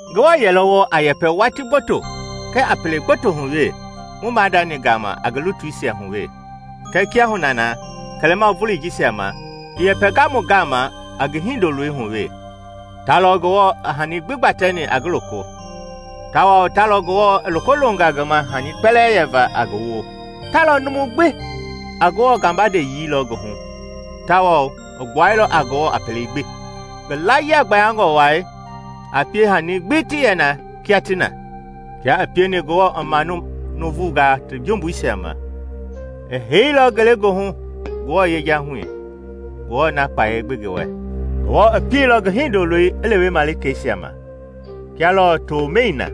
Ngewɔ yɛlɔ wɔɔ a yɛpɛ watii gboto kɛɛ a pele gboto hu wee mu maadani gama a ngi lutuisia hu wee, kɛɛ kiahuna na kɛlɛma voloi jisia ma, i yɛpɛnga mu gama a ngi Hindoloi hu wee. Ta lɔ Ngewɔ i hani gbi gbatɛni a ngi loko, tawao ta lɔ Ngewɔ i loko longa ngi ma hani kpɛlɛɛ yɛva a ngi woo. Ta lɔ numu a Ngewɔ gabandeyii lɔ ngi hu tawao i gbuailɔ a Ngewɔ a pelei gbi, ngi laayia gbayangɔ wai a pie hani gbi ti yɛ na kia ti na. Kia i pieni Ngewɔ i manu nuuvungaa ti jumbuisia ma, i heiilɔ ngelegoohu Ngewɔ yejahui, Ngewɔ na kpayei gbi i ngi wɛ. Ngewɔ i pieilɔ ngi Hindoloi i lewe malikeisia ma, kia lɔɔ tomɛi na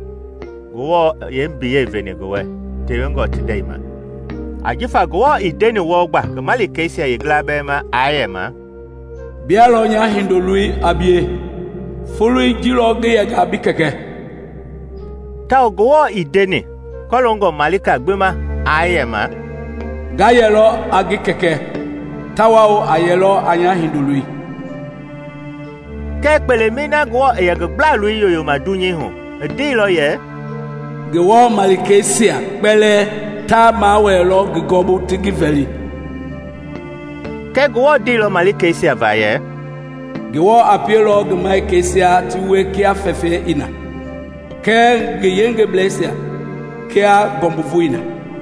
Ngewɔ i yeembiyei veni ngi wɛ tewengɔ ti ndɛi ma. Ajifa Ngewɔ ii ndeni wɔɔ gba ngi malikei yeengila bɛɛ ma aa yɛma, “Bia lɔ nya Hindoloi a bie; folei ji lɔ ngi yɛnga a bi Kɛkɛ.” Tawao Ngewɔ ii ndeni kɔloongɔ malika gbi ma aa yɛma, “Nga yɛlɔ a ngi Kɛkɛ tawao a yɛlɔ a nya Hindoloi.” Kɛɛ kpelei na Ngewɔ i yɛ ngi gbla-loi yoyoma dunyei hu, i ndeilɔ yɛ, “Ngewɔ malikeisia kpɛlɛɛ ta mawɛɛlɔ ngi gɔɔbu ti ngi vɛli.” Kɛ Ngewɔ ndeilɔ malikeisia va yɛ, “Ngewɔ a pielɔ ngi malikeisia ti wie kia fɛfɛi i na, kɛ ngi yengebleisia kia ngɔmbuvoi i na.”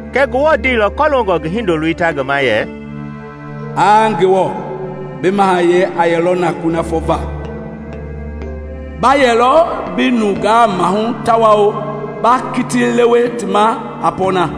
Kɛɛ Ngewɔ ndeilɔ kɔloongɔ ngi Hindoloi ta ngi ma yɛ, “Aa Ngewɔ, bi mahayɛi a yɛlɔ na kunafɔ va! Ba yɛlɔ bi nungaa mahu tawao ba kiti lewe ti ma a pɔɔna.”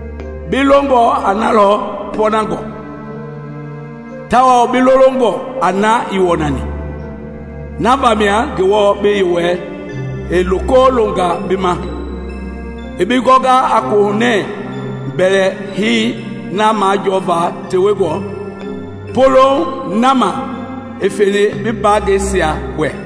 “Bi longɔ a na lɔ pɔɔnangɔ, tawao bi lolongɔ a na ii wɔnani; na vamia Ngewɔ, bi Yewɔɛi, i loko longa bi ma i bi gɔnga a koohunɛɛ mbɛlɛhei na majɔɔva tewengɔ polouŋ na ma i feni bi mbaangɛisia wɛ.”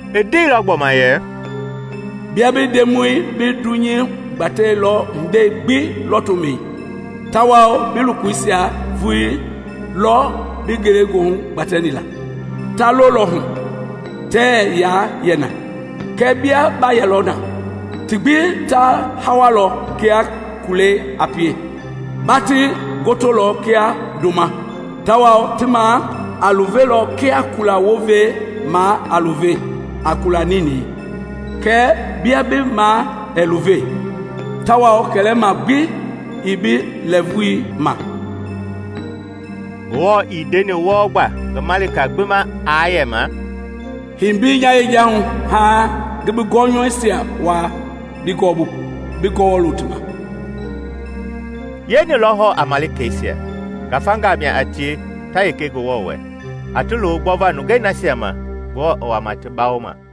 I ndeilɔ gbɔma yɛ, “Bia bi Ndemɔi bi dunyei gbatɛilɔ hindei gbi lɔtomɛi, tawao bi lokoisia vulii lɔ bi ngelegoohu gbatɛni la. Ta lolɔ hu, tɛɛ yaa yɛ na, kɛɛ bia ba yɛlɔ na; ti gbi ta hawalɔ kia kulɛi a pie. Ba ti gotolɔ kia ndoma, tawao ti maa a luvelɔ kia kula wovei maa a luve a kula ninɛi. Kɛɛ bia bi maa ɛɛ luve, tawao kɛlɛma gbi ii bi lɛɛvui ma.” Ngewɔ ii ndeni wɔɔ gba ngi malika gbi ma aa yɛma, “Hei mbei nya yejahui, haaŋ ngi bi gɔnyɔuisia wuaa bi gɔɔbu, bi gɔwɔ lo ti ma.” Yeeni lɔ hɔɔ a malikeisia? Ngafangaa mia a tie ta yenge Ngewɔ wɛ, a ti lo gbɔva nungei nasia ma Ngewɔ i wama ti bawoma.